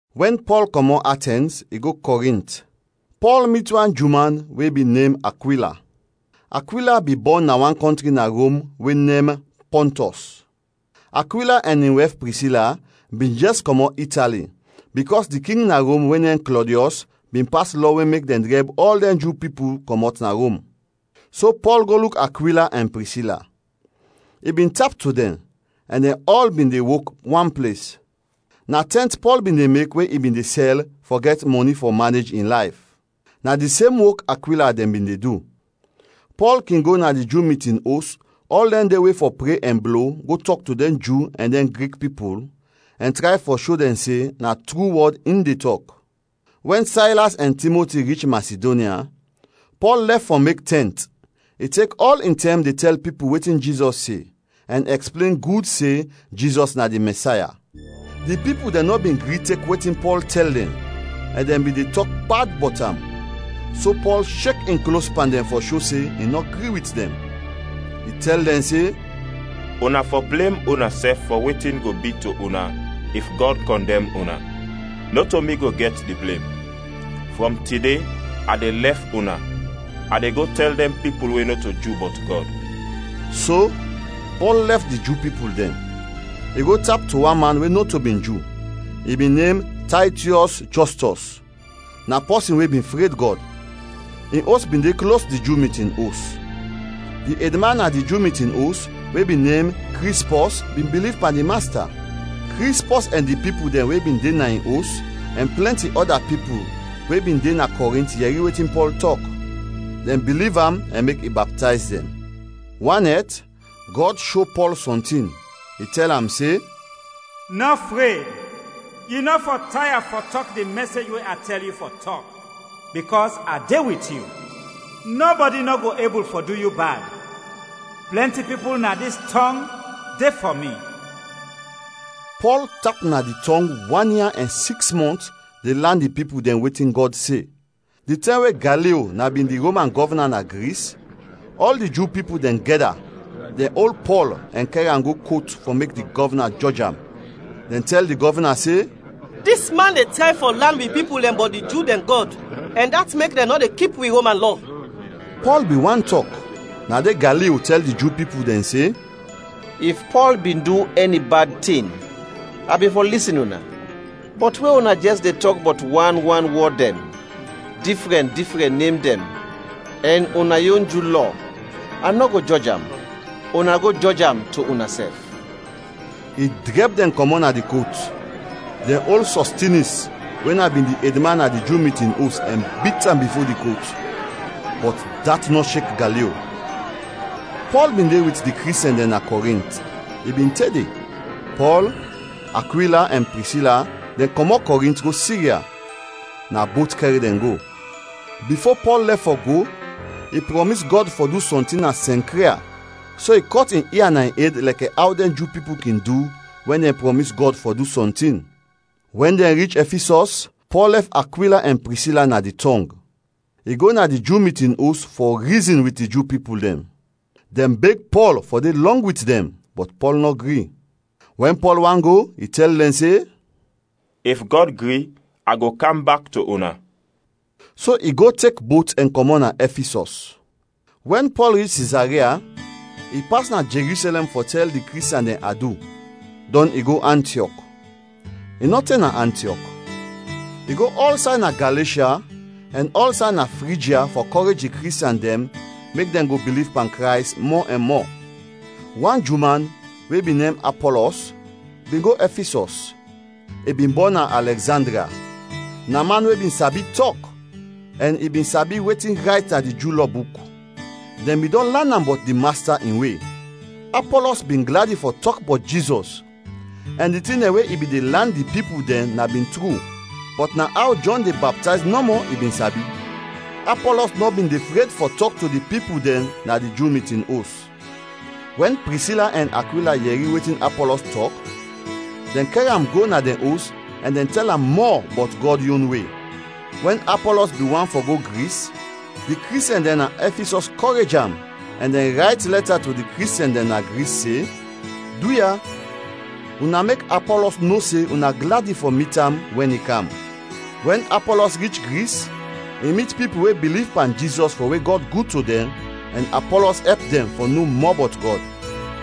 Wɛn Pɔl kɔmɔt Atɛns, i go Kɔrint. Pɔl mit wan Ju man we bin nem Akwila. Akwila bin bɔn na wan kɔntri na Rom we nem Pɔntɔs. Akwila ɛn in wɛf Prisila bin jɛs kɔmɔt Itali bikɔs di king na Rom we nem Klɔdiɔs bin pas lɔ we mek dɛn drɛb ɔl dɛn Ju pipul kɔmɔt na Rom. So Pɔl go luk Akwila ɛn Prisila. I bin tap to dɛn, ɛn dɛn ɔl bin de wok wan ples. Na tɛnt Pɔl bin de mek we i bin de sɛl fɔ gɛt mɔni fɔ manej in layf. Na di sem wok Akwila dɛn bin de du. Pɔl kin go na di Ju mitin os ɔl dɛn de we fɔ pre ɛn blo go tɔk to dɛn Ju ɛn dɛn Grik pipul, ɛn tray fɔ sho dɛn se na tru wɔd in de tɔk. Wɛn Saylas ɛn Timoti rich Masidonya, Pɔl lɛf fɔ mek tɛnt, i tek ɔl in tɛm de tɛl pipul wetin Jizɔs se, ɛn ɛksplen gud se Jizɔs na di Mɛsaya. Di pipul dɛn nɔ bin gri tek wetin Pɔl tɛl dɛn ɛn dɛn bin de tɔk bad bɔt am, so Pɔl shek in klos pan dɛn fɔ sho se in nɔ gri wit dɛn. I tɛl dɛn se, “Una fɔ blem unasɛf fɔ wetin go bi to una if Gɔd kɔndɛm una! Nɔto mi go gɛt di blem; frɔm tide a de lɛf una; a de go tɛl dɛn pipul we nɔto Ju bɔt Gɔd.” So, Pɔl lɛf di Ju pipul dɛn; i go tap to wan man we nɔto bin Ju, i bin nem Taytiɔs Jɔstɔs; na pɔsin we bin fred Gɔd. In os bin de klos di Ju mitin os. Di edman na di Ju mitin os we bin nem Krispɔs bin biliv pan di Masta. Krispɔs ɛn di pipul dɛn we bin de na in os, ɛn plɛnti ɔda pipul we bin de na Kɔrint yɛri wetin Pɔl tɔk; dɛn biliv am ɛn mek i baptayz dɛn. Wan nɛt, Gɔd sho Pɔl sɔntin; i tɛl am se, “Nɔ fred, yu nɔ fɔ taya fɔ tɔk di mɛsej we a tɛl yu fɔ tɔk, bikɔs a de wit yu. Nɔbɔdi nɔ go ebul fɔ du yu bad. Plɛnti pipul na dis tɔng de fɔ mi.” Pɔl tap na di tɔng wan ia ɛn siks mɔnt de lan di pipul dɛn wetin Gɔd se. Di tɛm we Galio na bin di Roman gɔvna na Gris, ɔl di Ju pipul dɛn gɛda, dɛn ol Pɔl ɛn kɛr am go kot fɔ mek di gɔvna jɔj am. Dɛn tɛl di gɔvna se, “Dis man de tray fɔ lan wi pipul dɛn bɔt di Ju dɛn Gɔd ɛn dat mek dɛn nɔ de kip wi Roman lɔ.” Pɔl bin want tɔk, na de Galio tɛl di Ju pipul dɛn se, “If Pɔl bin du ɛni bad tin, a bin fɔ lisin una. Bɔt we una jɛs de tɔk bɔt wan wan wɔd dɛn, difrɛn, difrɛn nem dɛn, ɛn una yon Ju Lɔ, a nɔ go jɔj am. Una go jɔj am to unasɛf.” I drɛb dɛn kɔmɔt na di kot. Dɛn ol Sɔstinis we na bin di edman na di Ju mitin os ɛn bit am bifo di kot. Bɔt dat nɔ shek Galio. Pɔl bin de wit di Kristiɛn dɛn na Kɔrint, i bin te de. Pɔl, Akwila, ɛn Prisila dɛn kɔmɔt Kɔrint go Sirya; na bot kɛr dɛn go. Bifo Pɔl lɛf fɔ go, i prɔmis Gɔd fɔ du sɔntin na Sɛnkria so i kɔt in ia na in ed lɛkɛ aw dɛn Ju pipul kin du wɛn dɛn prɔmis Gɔd fɔ du sɔntin. Wɛn dɛn rich Ɛfisɔs, Pɔl lɛf Akwila ɛn Prisila na di tɔng, i go na di Ju mitin os fɔ rizin wit di Ju pipul dɛn. Dɛn beg Pɔl fɔ de lɔng wit dɛn, bɔt Pɔl nɔ gri. Wɛn Pɔl want go, i tɛl dɛn se, “If Gɔd gri, a go kam bak to una.” So i go tek bot ɛn kɔmɔt na Ɛfisɔs. Wɛn Pɔl rich Sizaria, i pas na Jerusɛlɛm fɔ tɛl di Kristiɛn dɛn adu, dɔn i go Antiɔk. I nɔ te na Antiɔk. I go ɔlsay na Galeshya ɛn ɔlsay na Frijya fɔ kɔrej di Kristiɛn dɛn mek dɛn go biliv pan Krays mɔ ɛn mɔ. Wan Ju man we bin nem Apɔlɔs bin go Ɛfisɔs. I bin bɔn na Alɛgzandria. Na man we bin sabi tɔk ɛn i bin sabi wetin rayt na di Ju Lɔ buk. Dɛn bin dɔn lan am bɔt di Masta in We. Apɔlɔs bin gladi fɔ tɔk bɔt Jizɔs ɛn di tin dɛn we i bin de lan di pipul dɛn na bin tru, bɔt na aw Jɔn de baptayz nɔmɔ i bin sabi. Apɔlɔs nɔ bin de fred fɔ tɔk to di pipul dɛn na di Ju mitin os. Wɛn Prisila ɛn Akwila yɛri wetin Apɔlɔs tɔk, dɛn kɛr am go na dɛn os ɛn dɛn tɛl am mɔ bɔt Gɔd yon We. Wɛn Apɔlɔs bin want fɔ go Gris, di Kristiɛn dɛn na Ɛfisɔs kɔrej am ɛn dɛn rayt lɛta to di Kristiɛn dɛn na Gris se, “Duya, una mek Apɔlɔs no se una gladi fɔ mit am wɛn i kam.” Wɛn Apɔlɔs rich Gris, i mit pipul we biliv pan Jizɔs fɔ we Gɔd gud to dɛn ɛn Apɔlɔs ɛp dɛn fɔ no mɔ bɔt Gɔd.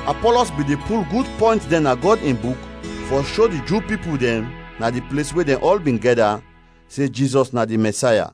Apɔlɔs bin de pul gud pɔynt dɛn na Gɔd in Buk fɔ sho di Ju pipul dɛn, na di ples we dɛn ɔl bin gɛda, se Jizɔs na di Mɛsaya.